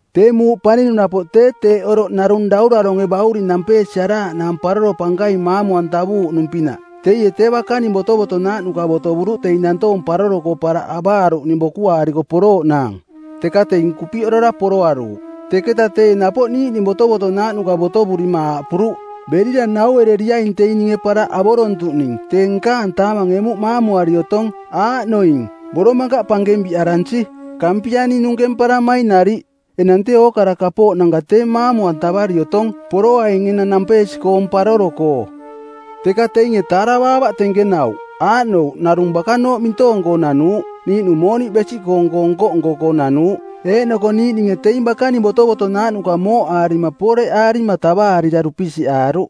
“Tee muuꞌ paninung napoꞌ tee teeꞌ oroꞌ narung dauraronge˜ bauring nampeesiaraaꞌnaang paroro pankaing maamu-antavuuꞌnung-pinaꞌ. Teie tee bakaning botovotonaaꞌnuka botovuruꞌ teing nantoong paroro-koo paraꞌ avaaruꞌning bokuaariko porooꞌnaang, teka teing kupiꞌorora poroaruuꞌ. Teketa teie napoꞌ niiꞌning botovotonaaꞌnuka botovurima aaꞌpuruꞌ, ‘Berira nauereriaing teing ninge paraꞌ avorontuꞌning tee nkaang taamang emuꞌ maamuari otong. Aaꞌnoing boromakaꞌ pankeng biꞌaransi, kampianing nunkemparamaing nariꞌ. Enang tee ookara kapooꞌnanka tee maamu-antavari otong. Poroaing enang nampeesi-koong paroro-koo.’ “Teka teinge taaravaavaꞌ tenkenauꞌ, aaꞌnouꞌ narung bakanooꞌ mintoong-koo nanuuꞌ, niiꞌnung mooniꞌ besiꞌkoong-koo nko-nko-koo nanuuꞌ. Eeꞌnoko niiꞌninge teing bakaning botovotonaaꞌnuka mooꞌaarima pooreꞌaarima tavaarira dupisiꞌaaruꞌ.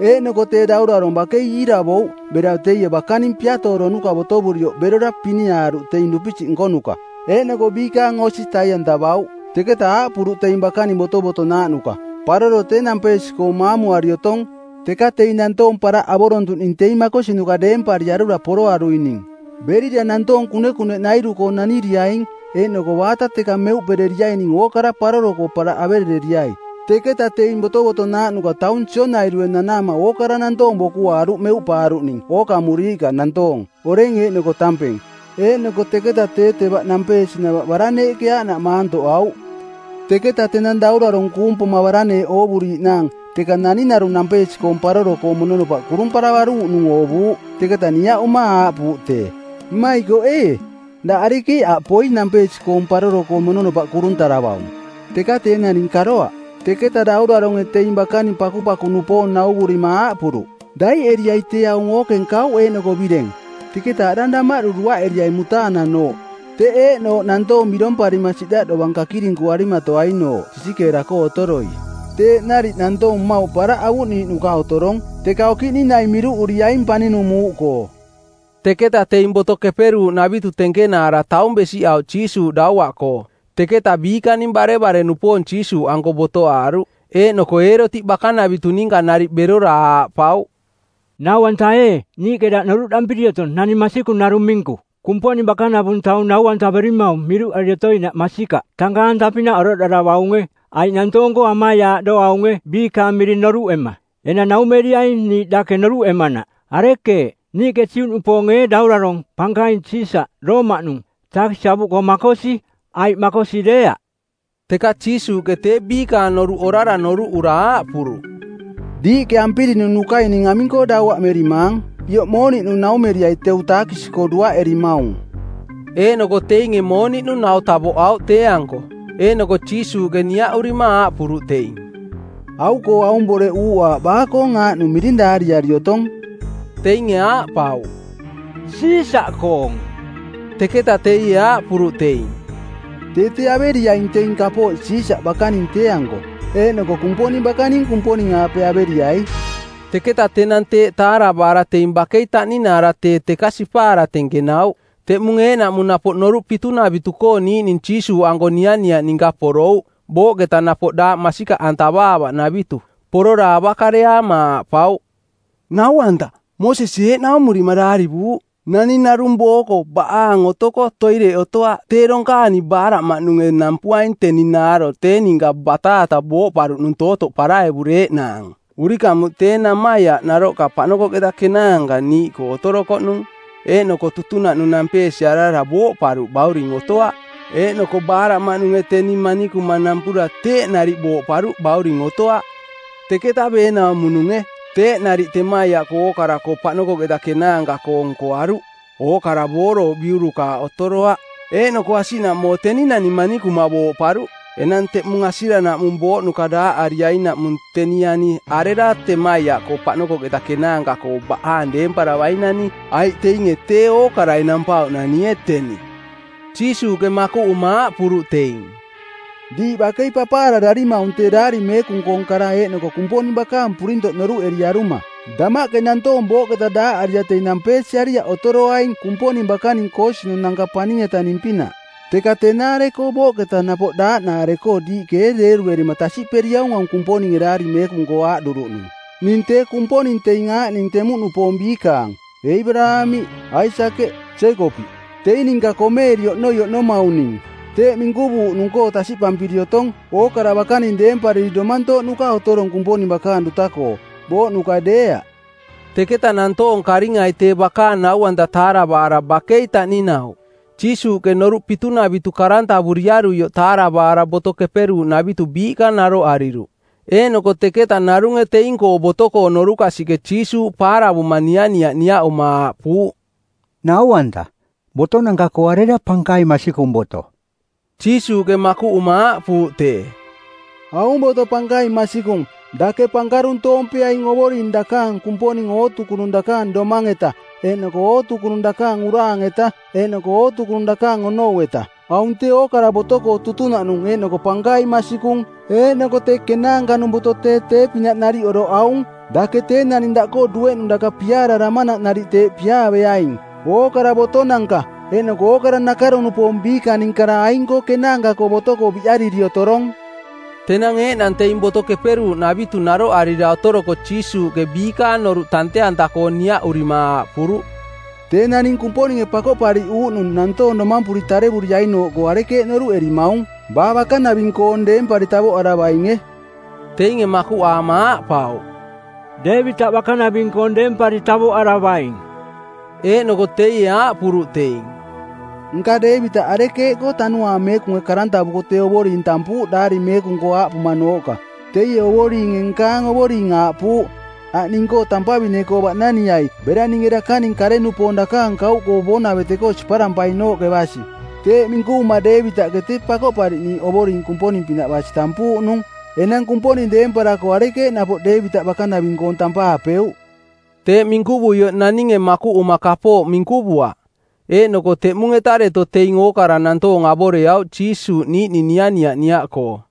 Eeꞌnoko tee daurarong bakei iiravouꞌ bera teie bakaning piatooronuka˜ botovurioꞌ berora piniaaruꞌ teing dupisiꞌ nkonuka, eeꞌnoko biikaang osi tai-antavauꞌ. Teketa aaꞌpuruꞌ teing bakaning botovotonaaꞌnuka, ‘Paroro tee nampeesi-koong maamuari otong, teka teing nantoong paraꞌ avorontuꞌning teing makosinuka deempariarura poroaruining. Berira nantoong kunekuneꞌnairu-koo naniriaing eeꞌnoko baata teka meuꞌpereriaining ookara paroro-koo paraꞌ averereriai.’ Teketa teing botovotonaaꞌnuka taung sionairue nanaama ookara nantoong bokuaaruꞌ meuꞌpaaruꞌning ookamuriiꞌka nantoong, oreng eeꞌnoko tampeng. Eeꞌnoko teketa tee tevaꞌ nampeesinava baraneeꞌke aaꞌnaꞌ maantoꞌauꞌ. “Teketa tenang daurarong kuung poma baraneeꞌ oovuriiꞌnaang teka naning narung nampeesi-koong paroro-koo mononopaꞌ kurumparavaruuꞌnung oovuuꞌ. Teketa niaꞌuma aaꞌpuuꞌ tee, ‘Mmaikoꞌ ee, daꞌ arekeeꞌ aꞌ poi nampeesi-koong paroro-koo mononopaꞌ kuruntaravaung?’ Teka tee naning karoaꞌ. Teketa dauraronge teing bakaning pakupaku-nupoong nauvurima aaꞌpuruꞌ, ‘Daiꞌeriai tee aung ookeng kauꞌ eeꞌnoko bireng. Teketa aꞌdang damaꞌdu duaꞌeriai mutaananooꞌ, teꞌ eeꞌnooꞌ nantoong biromparima siꞌdaꞌ dovang kakirinkuarimatoainooꞌ sisikeera-koo otoroi.’ Teeꞌ nariꞌ nantoong mmauꞌ paraꞌ avuꞌniiꞌnuka otorong, teka okiꞌning naing miruꞌuriaing paninung muuꞌkoo.” Teketa teing Boto Keperuuꞌnavitu tenkenaara taung besiꞌauꞌ Jiisuuꞌ dauaꞌkoo. Teketa biikaning barevare-nupoong Jiisuuꞌanko botoaaruꞌ. Eeꞌnoko Eerotiꞌ bakanavitu ninka nariꞌ berora aaꞌpauꞌ, “Nau-anta ee, niiꞌke daꞌ noruꞌdampiri otong naning masikung narung minku. Kumponing bakanavung taung nau-antaverimaung miruꞌari otoinaꞌ masikaꞌ. Tankaang-anta-pinaꞌ oroꞌdaravaunge, aiꞌ nantoong-koo amaiaaꞌdoaunge biikaang miring noruꞌema. Enang naumeriaing niiꞌ dake noruꞌemanaꞌ: Arekeeꞌ, niiꞌke Juꞌnupoonge ee daurarong˜ pankaing, Siisaꞌ˜, Roomaꞌnung, taakisi avuꞌkoo makosi, aiꞌ makosi deeaꞌ?” Teka Jiisuuꞌke tee biikaang noruꞌ orara noruꞌura aaꞌpuruꞌ, “Diiꞌke ampirinunukai ning aming-koo dauaꞌmerimaang? Ioꞌ mooniꞌnu naumeriai teu taakisi-koo duaꞌerimaung.” Eeꞌnoko teinge mooniꞌnu nau tavoꞌauꞌ tee-anko. Eeꞌnoko Jiisuuꞌke niaꞌurima aaꞌpuruꞌ teing, “Au-koo aung boreꞌ uuꞌaaꞌ baa-koong aaꞌnung miring daariari otong?” Teinge aaꞌpauꞌ, “Siisaꞌkoong.” Teketa teie aaꞌpuruꞌ teing, “Tee tee averiaing teing kapooꞌ Siisaꞌ bakaning tee-anko, eeꞌnoko Kumponing bakaning Kumponing-aape averiai.” Teketa tenang teeꞌ taaravaara teing bakei taꞌninaara tee teka sipaara tenkenauꞌ. Teꞌmung eeꞌnaꞌmung napoꞌ noruꞌ pitunavitu-koo niiꞌning Jiisuuꞌanko nianiaꞌ ninka porouꞌ, booꞌketa napoꞌ daaꞌ masikaꞌantavaavaꞌnavitu. Porora avakareaama aaꞌpauꞌ, “Nau-anta, Moosesie eeꞌ naumurima daarivuuꞌ, ‘Naning narung booko baꞌaang otoko toireꞌ otoaꞌ tee donkaani baaraꞌmaꞌnunge nampuaing teni naaro tee ninka bataata booꞌparuꞌnung tootoꞌ paraevureeꞌnaang.’ Urikamuꞌ tee namaiaꞌ naroꞌka paꞌnokoꞌketa kenaanka niiꞌkoo otorokoꞌnung. Eeꞌnoko tutunaꞌnung nampeesiarara booꞌparuꞌ bauring otoaꞌ. Eeꞌnoko baaraꞌmaꞌnunge teni manikuma nampura teeꞌ nariꞌ booꞌparuꞌ bauring otoaꞌ. Teketa beenaumo-nunge. Teeꞌ nariꞌ temaiaꞌkoo ookara-koo paꞌnokoꞌketa kenaanka-koo nkoaruꞌ. Ookara boorouꞌ biurukaaꞌ otoroaꞌ. Eeꞌnoko asiꞌnaꞌmoo teni nani manikuma booꞌparuꞌ. Enang teꞌmung asiranaꞌmung booꞌnuka daaꞌariainaꞌmung teni ani arera temaiaꞌkoo paꞌnokoꞌketa kenaanka-koo baꞌaang deemparavainani? Aiꞌ teinge tee ookarai nampauꞌnanie teni.” Jiisuuꞌke makuꞌuma aaꞌpuruꞌ teing, “Diiꞌ bakei papaarararimaung tee Daari Meekung-koong kara eeꞌnoko Kumponing bakaang purintoꞌ noruꞌeriaruma. Damaꞌke nantoong booꞌketa daaꞌarira teing nampeesiariaꞌ otoroaing Kumponing bakaning koosinunanka paning-etaning-pinaꞌ. Teka tenaare-koo booꞌketa napoꞌ daaꞌnaare-koo diiꞌke ee deeruerima tasiꞌperiaung aung Kumponinge Daari Meekung-koo aaꞌduruꞌnung, ‘Ning tee Kumponing teing aing aaꞌning temuꞌnupoong biikaang: Eebaraamiꞌ, Aisakeꞌ, Jeekopiꞌ. Teing ninka komeeri Oꞌnoi Oꞌnomaung ning.’? Teeꞌ minkuvuuꞌnung-koo tasiꞌpampiri otong ookara bakaning deempariri domantooꞌnuka otorong Kumponing bakaang duta-koo, booꞌnuka deeaꞌ.” Teketa nantoong karingai tee bakaang nau-anta taaravaara bakei taꞌninauꞌ. Jiisuuꞌke noruꞌ pitunavitu karantavuriaruioꞌ taaravaara Boto Keperuuꞌnavitu biiꞌka naroꞌariruꞌ. Eeꞌnoko teketa narunge teing-koo boto-koo norukasiꞌke Jiisuuꞌ paaravuma nianiaꞌ niaꞌuma aaꞌpuuꞌ, “Nau-anta, botonanka-koo arera pankaing masikung boto?” Jiisuuꞌke makuꞌuma aaꞌpuuꞌ tee, “Aung boto pankaing masikung: ‘Dake pankaruntoompeaing Ovoring dakaang Kumponing ootukunung dakaang domang-eta eeꞌnoko ootukunung dakaang uraang-eta˜ eeꞌnoko ootukunung dakaang onou-eta.’ Aung tee ookara-koo boto-koo tutunaꞌnung eeꞌnoko pankaing masikung. Eeꞌnoko tee kenaanka-nung boto tee tee-pinaꞌ nariꞌ oroꞌ aung: ‘Dake tee naning daꞌkoo dueꞌnung daka piaararamanaꞌ nariꞌ teeꞌ piaaveaing.’ Ookara botonanka eeꞌnoko nakaro-nupoong biikaning kara aing-koo kenaanka-koo boto-koo biꞌariri otorong.” Tenang eeꞌnang teing Boto Keperuuꞌnavitu naroꞌarira otoroko Jiisuuꞌke biikaang noruꞌ tante-anta-koo niaꞌurima aaꞌpuruꞌ, “Tee naning Kumponinge Pakoꞌpariꞌuuꞌnung˜ nantoong domampuri tarevuriainooꞌkoo arekeeꞌ noruꞌerimaung, baa bakanaving-koong deempari tavoꞌaravainge?” Teinge makuꞌaama aaꞌpauꞌ, “Deevitaꞌ bakanaving-koong deempari tavoꞌaravaing.” Eeꞌnoko teie aaꞌpuruꞌ teing, “Nka Deevitaꞌ arekeeꞌkoo Tanuaang Meekunge karantavuko tee Ovoring tampuuꞌ Daari Meekung-koo aaꞌpumanooꞌka, ‘Teie Ovoringe nkaang Ovoring aaꞌpuuꞌ, “Aꞌ, ning-koo tampavine-koo baꞌnaniai bera ninge dakaning kare-nupoong dakaang kauꞌkoo boonavete-koo siparampainooꞌke basi.” ’ Teeꞌ minkuvuma Deevitaꞌke tee Pakoꞌpariꞌniiꞌ Ovoring Kumponing-pinaꞌ basi tampuuꞌnung. Enang Kumponing deemparako arekeeꞌ napoꞌ Deevitaꞌ bakanaving-koong tampaapeuꞌ?” Teeꞌ minkuvuioꞌ naninge makuꞌuma kapooꞌ minkuvuaꞌ, eeꞌnoko teꞌmung-eta deto teing ookara nantoong avoreauꞌ Jiisuuꞌ niiꞌning nianiaꞌ niaꞌkoo.